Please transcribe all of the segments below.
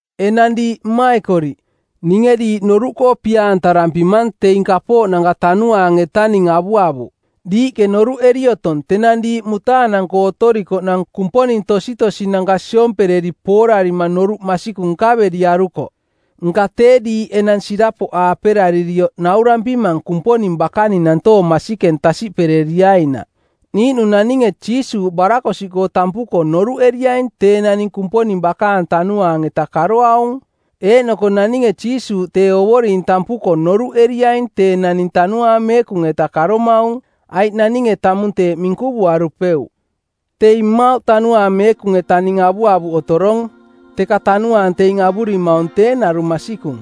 Enang diiꞌ mmaikoriꞌ, ninge diiꞌ noruꞌkoo pia-antarampimang teing kapooꞌnanka Tanuaang-etaning avuavuꞌ. Diiꞌke noruꞌeri otong tenang diiꞌ mutaanang-koo otorikoꞌnang Kumponing tositosinanka siompereri poorarima noruꞌ masikung nkaveriarukoꞌ. Nka tee diiꞌ enang sirapoꞌaaperaririoꞌ naurampimang Kumponing bakaning nantoong masikeng tasiꞌpereriainaꞌ. Niiꞌnung naninge Jiisuuꞌ barakosiꞌkoo tampuko noruꞌeriaing tee naning Kumponing bakaang Tanuaang-eta karoaung. Eeꞌnoko naninge Jiisuuꞌ tee Ovoring tampuko noruꞌeriaing tee naning Tanuaang Meekung-eta karomaung, aiꞌ naninge tamung teeꞌ minkuvuarupeuꞌ. Teing mmauꞌ Tanuaang Meekung-etaning avuavuꞌ otorong, teka Tanuaang teing avurimaung tee narung masikung.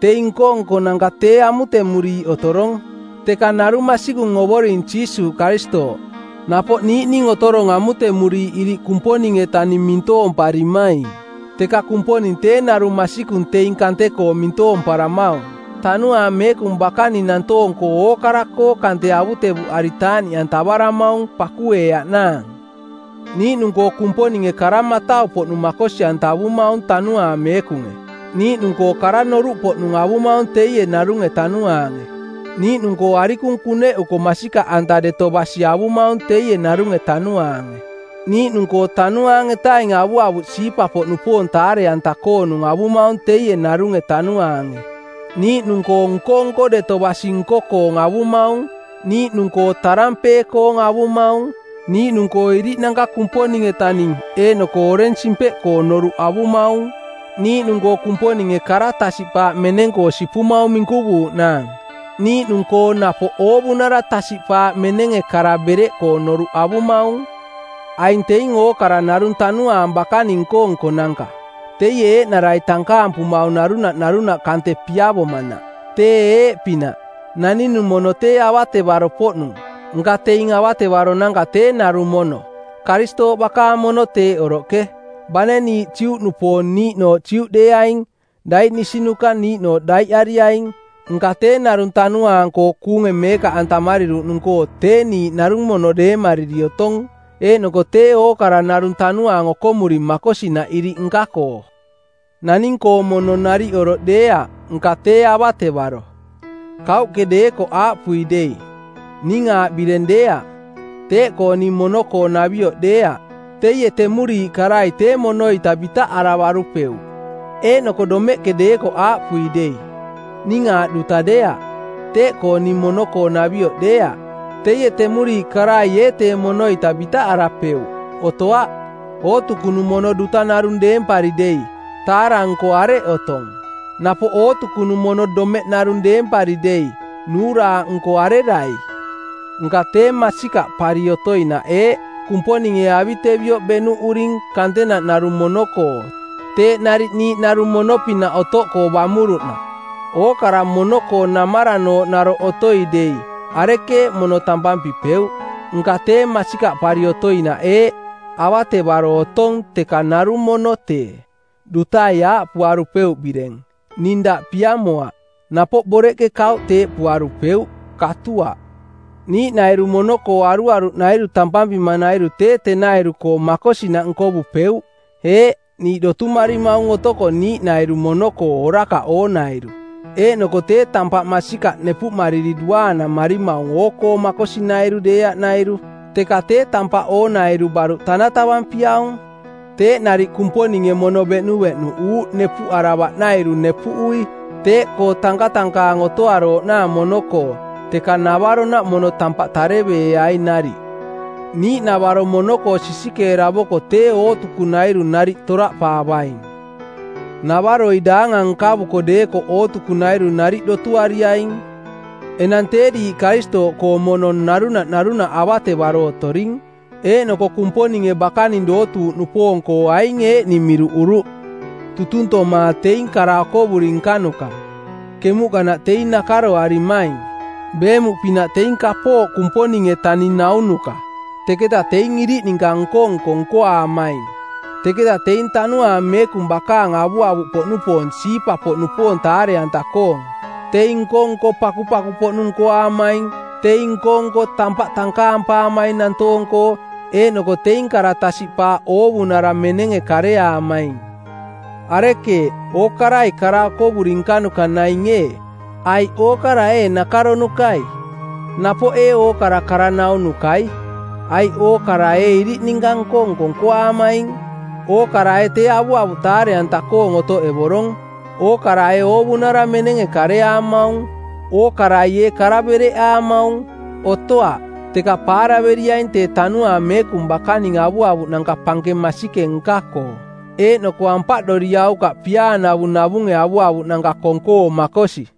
Teing nko-nkonanka tee amutemuriiꞌ otorong, teka narung masikung Ovoring Jiisuuꞌ Karistooꞌ. Napoꞌ niiꞌning otorong amutemuriiꞌ iriꞌ Kumponing-etaning mintoomparimaing, teka Kumponing tee narung masikung teing kante-koo mintoomparamaung. Tanuaang Meekung bakaning nantoong-koo ookara-koo kante avutevuꞌari taaꞌniꞌantavaramaung, pakueeaꞌnaang. Niiꞌnung-koo Kumponinge kara matau-poꞌnung makosi-antavumaung Tanuaang Meekunge. Niiꞌnung-koo kara noruꞌpoꞌnung avumaung teie narunge Tanuaange. Niiꞌnung-koo arikung kuneꞌuko masikaꞌanta deto basi avumaung teie narunge Tanuaange. Niiꞌnung-koo Tanuaang-etaing avuavuꞌ siipa-poꞌnupoong taare-anta-koonung avumaung teie narunge Tanuaange. Niiꞌnung-koo nko-nko deto basi nko-koong avumaung. Niiꞌnung-koo tarampee-koong avumaung. Niiꞌnung-koo iriꞌnanka Kumponing-etaning eeꞌnoko oreng simpeꞌkoong noruꞌ avumaung. Niiꞌnung-koo Kumponinge kara tasiꞌpaaꞌ meneng-koo sipumaung minkuvuuꞌnaang. Niiꞌnung-koo napoꞌ oovunara tasiꞌpaaꞌ menenge kara bereꞌkoong noruꞌ avumaung. Aing teing ookara narung Tanuaang bakaning nko-nkonanka. Teie eeꞌnarai tankaampumaung narunaꞌ narunaꞌ kante piavomanaꞌ. Tee eeꞌpinaꞌ: Naninung mono tee avatevaro-poꞌnung, nka teing avatevaronanka tee narung mono. Karistooꞌ bakaang mono teeꞌ oroꞌke. Bane niiꞌ Juꞌnupoong niiꞌnooꞌ Juꞌdeeaing, daiꞌnisinuka niiꞌnooꞌ daiꞌariaing, nka tee narung Tanuaang-koo kuunge meekaꞌantamariruꞌnung-koo tee niiꞌ narung mono deemariri otong eeꞌnoko tee ookara narung Tanuaang okomuring makosinaꞌ iriꞌ nka-koo. Naning-koong mono nariꞌ oroꞌ deeaꞌ, nka tee avatevaro. Kauꞌke deekoꞌ aaꞌpui dei, “Ning aaꞌ bireng deeaꞌ, teeꞌkoo ning mono-koo-navioꞌ deeaꞌ,” teie temuriiꞌ karai tee mono-ita bitaꞌaravarupeuꞌ. Eeꞌnoko domeꞌke deekoꞌ aaꞌpui dei, “Ning aaꞌ duta deeaꞌ, teeꞌkoo ning mono-koonavioꞌ deeaꞌ,” teie temuriiꞌ karai ee temono-ita bitaꞌarapeuꞌ? Otoaꞌ. Ootukunung mono duta narung deempari dei, taara-nko areꞌ otong? Napoꞌ ootukunung mono domeꞌ narung deempari dei nuuraaꞌnko arerai? Nka tee masikaꞌpari otoinaꞌ eeꞌ: Kumponinge avitevioꞌ beꞌnuꞌuring kantenaꞌ narung mono-koo teeꞌ nariꞌ niiꞌ narung mono-pinaꞌ otoꞌkoo bamuruꞌnaꞌ. Ookara mono-koo namaranooꞌ naroꞌ otoi dei, arekeeꞌ mono tampampipeuꞌ? Nka tee masikaꞌpari otoinaꞌ eeꞌ: Avatevaro otong teka narung mono tee. Dutai aaꞌpuarupeuꞌ bireng, “Ning daꞌ piamoaꞌ.” Napoꞌ boreꞌke kauꞌ teeꞌpuarupeuꞌ. Katuaꞌ. Niiꞌnairu mono-koo aruaruꞌnairu tampampimanairu tee tenairu-koo makosinaꞌ nkovupeuꞌ. Eeꞌ, niiꞌ dotumarimaung otoko niiꞌnairu mono-koo orakaꞌ oonairu, eeꞌnoko tee tampaꞌ masikaꞌ nepuꞌmariri duaanamarimaung oo-koo makosinairu deeaꞌnairu. Teka tee tampaꞌ oonairu baruꞌ tanatavampiaung. Teeꞌ nariꞌ Kumponinge mono beꞌnuveꞌnuꞌuuꞌ nepuꞌaravaꞌnairu nepuꞌui. Teeꞌkoo tankatankaang otoarooꞌnaang mono-koo, teka navaronaꞌ mono tampaꞌ tanataveeai nariꞌ. Niiꞌnavaro mono-koo sisikeeravoko tee ootukunairu nariꞌ toraꞌpaavaing. Navaroi daangang nkavuko deekoꞌ ootukunairu nariꞌ dotuariaing. Enang tee diiꞌ Karistooꞌkoong mono, narunaꞌ narunaꞌ avatevaro otoring. Eeꞌnoko Kumponinge bakaning dootuuꞌnupoong-koo aing eeꞌning miruꞌuruꞌ: tutuntoma teing kara okovuri nkanuka, kemuꞌkanaꞌ teing nakaroarimaing˜, beemuꞌpinaꞌ teing kapooꞌ Kumponing-etaning naunuka, teketa teing iriꞌ ninka nko-nko nkoaamaing, teketa teing Tanuaang Meekung bakaang avuavuꞌpoꞌnupoong siipa-poꞌnupoong taare-anta-koong, teing nko-nko pakupaku-poꞌnung nkoaamaing, teing nko-nko tampaꞌ tankaampaamaing nantoong-koo, eeꞌnoko teing kara tasiꞌpaaꞌ oovunara menenge kareaamaing. Arekeeꞌ, ookarai kara okovuri nkanuka naing ee? Aiꞌ ookara ee nakaronukai? Napoꞌ ee ookara kara-naunukai? Aiꞌ ookarai ee iriꞌ ninka nko-nko nkoaamaing? Ookara ee tee avuavuꞌ taare-anta-koong otoꞌevorong? Ookara ee oovunara menenge kareaamaung? Ookarai ee kara bereꞌaamaung? Otoaꞌ. Teka paaraveriaing tee Tanuaang Meekung bakaning avuavuꞌnanka pankeng masikeng nka-koo. Eeꞌnoko ampaꞌdoriaukaꞌ piaanavung navunge avuavuꞌnanka kong-koo makosi.